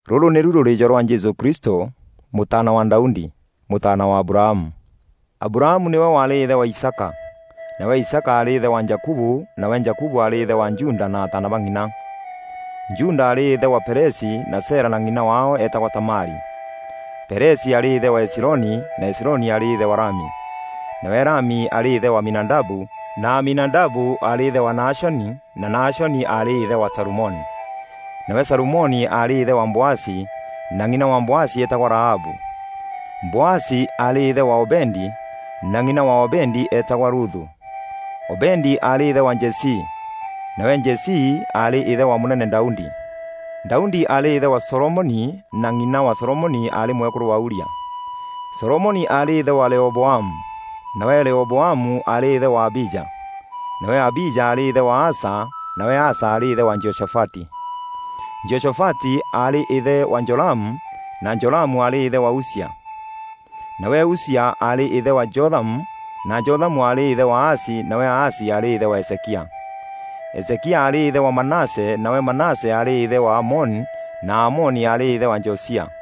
Rûrû nîru rûrîîjo rwa Jesû Kristû, mûtaana wa Daudi, mûtaana wa Abrahamu. Abrahamu nîwe waarî îthe wa Isaaka. Nawe Isaaka aarî îthe wa Jakubu nawe Jakubu aarî îthe wa Juda na ataana ba ng'ina. Juda aarî îthe wa Perezi na Zera na ng'ina waao eetagwa Tamari. Perezi aarî îthe wa Hezironi na Hezironi aarî îthe wa Rami. Nawe Rami aarî îthe wa Aminadabu na Aminadabu aarî îthe wa Nahashoni na Nahashoni aarî îthe wa Salumoni. Nawe Salumoni aarî îthe wa Boazi na ng'ina wa Boazi eetagwa Rahabu. Boazi aarî îthe wa Obedi na ng'ina wa Obedi eetagwa Ruthu. Obedi aarî îthe wa Jesii. Nawe Jesii aarî îthe wa mûnene Daudi. Daudi aarî îthe wa Solomoni na ng'ina wa Solomoni aarî mwekûrû wa Uria. Solomoni aarî îthe wa Rehoboamu, nawe Rehoboamu aarî îthe wa Abija. Nawe Abija aarî îthe wa Asa nawe Asa aarî îthe wa Jehoshafati. Jehoshafati aarî îthe wa Joramu na Joramu aarî îthe wa Uzia. Nawe Uzia aarî îthe wa Jothamu na Jothamu aarî îthe wa Ahazi nawe Ahazi aarî îthe wa Hezekia. Hezekia aarî îthe wa Manase nawe Manase aarî îthe wa Amoni na Amoni aarî îthe wa Josia.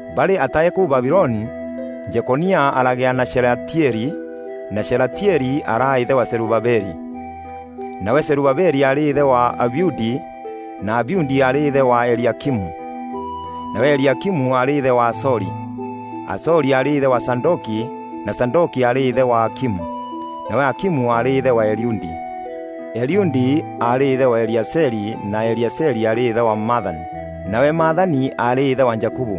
Barî atae kûu Babiloni, Jekonia aragîa na Shelatieli na Shelatieli araa îthe wa Zerubabeli. Nawe Zerubabeli aarî îthe wa Abiudi na Abiudi aarî îthe wa Eliakimu. Nawe Eliakimu aarî îthe wa Azori. Azori aarî îthe wa Zadoki na Zadoki aarî îthe wa Akimu. Nawe Akimu aarî îthe wa Eliudi. Eliudi aarî îthe wa Eleazari na Eleazari aarî îthe wa Mathani. Nawe Mathani aarî îthe wa Jakubu.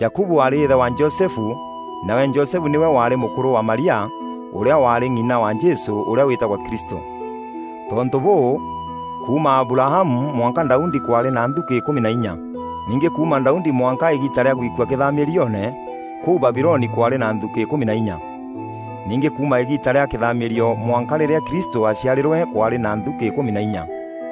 Jakubu aarî îthe wa Josefu nawe Josefu nîwe waarî mûkûrû wa Maria, ûrîa waarî ng'ina wa Jesû ûrîa wîtagwa Kristû. Tontû bûû, kuuma Abrahamu mwanka Daudi kwaarî na nthukî îkûmî na inya. Ningî kuuma Daudi mwanka îgiita rîa gwikua kîthamîrioone kûu Babiloni kwaarî na nthukî îkûmi na inya. Ningî kuuma îgiita rîa kîthamîrio mwanka rîrîa Kristû aaciarîrwe kwaarî na nthukî îkûmi na inya.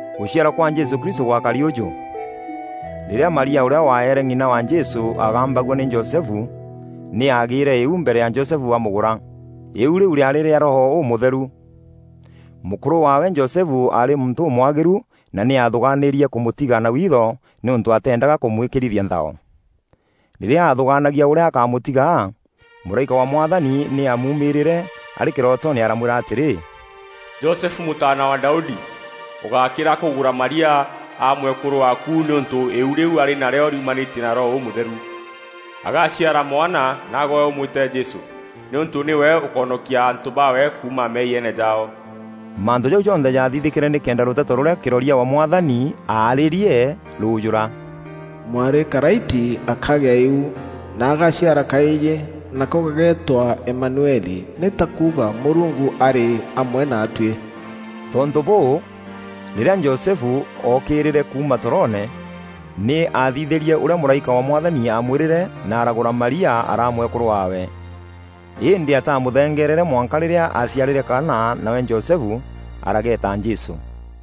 Gûciarwa kwa Jesû Kristû gwakari ûjû. Rîrîa Maria ûrîa waeere ng'ina wa Jesû aagambagua nî Josefu, nî aagîîre îu mbere ya Josefu amûgûra. Îîu rîu rîaarî rîa Roho Ûmûtheru. Mûkûrû waawe Josefu aarî muntû ûmwagîru na nî aathûgaanîrie kûmûtiga na witho nîûntû ateendaga kûmwîkîrithia nthao. Rîrîa aathûgaanagia ûrîa akamûtiga, mûraîka wa Mwathani nî aamuumîrîîre arî kîrootoone aramwîra atîrî, “Josefu mûtaana wa Daudi, ûgákîra kûgûra Maria aa mwekûrû waaku nîûntû îîu rîu arî narîo rîumanîtie na Roho Ûmûtheru. Agaaciara mwana, naagwe ûmwîte Jesû, nîûntû nîwe ûkoonokia antû baawe kuuma meeyiene jaao.” Mantû jau jonthe jaathithîkîre nîkenda rûteto rûrîa kîroria wa Mwathani aarîîrie rûûjûra: “Mwarî karaiti akagea îu na agaciara kaîjî, nako gageetwa Emanueli, nî ta kuuga, ‘Mûrungu arî amwe naatuî.’” Tontû bûû, rîrîa Josefu ookîrîîre kuuma toroone, nî aathithîrie ûrîa mûraîka wa Mwathani amwîrîre na aragûra Maria araa mwekûrû waawe. Îndî atamûthengereere mwanka rîrîa aaciarîre kaana nawe Josefu arageeta Jesû.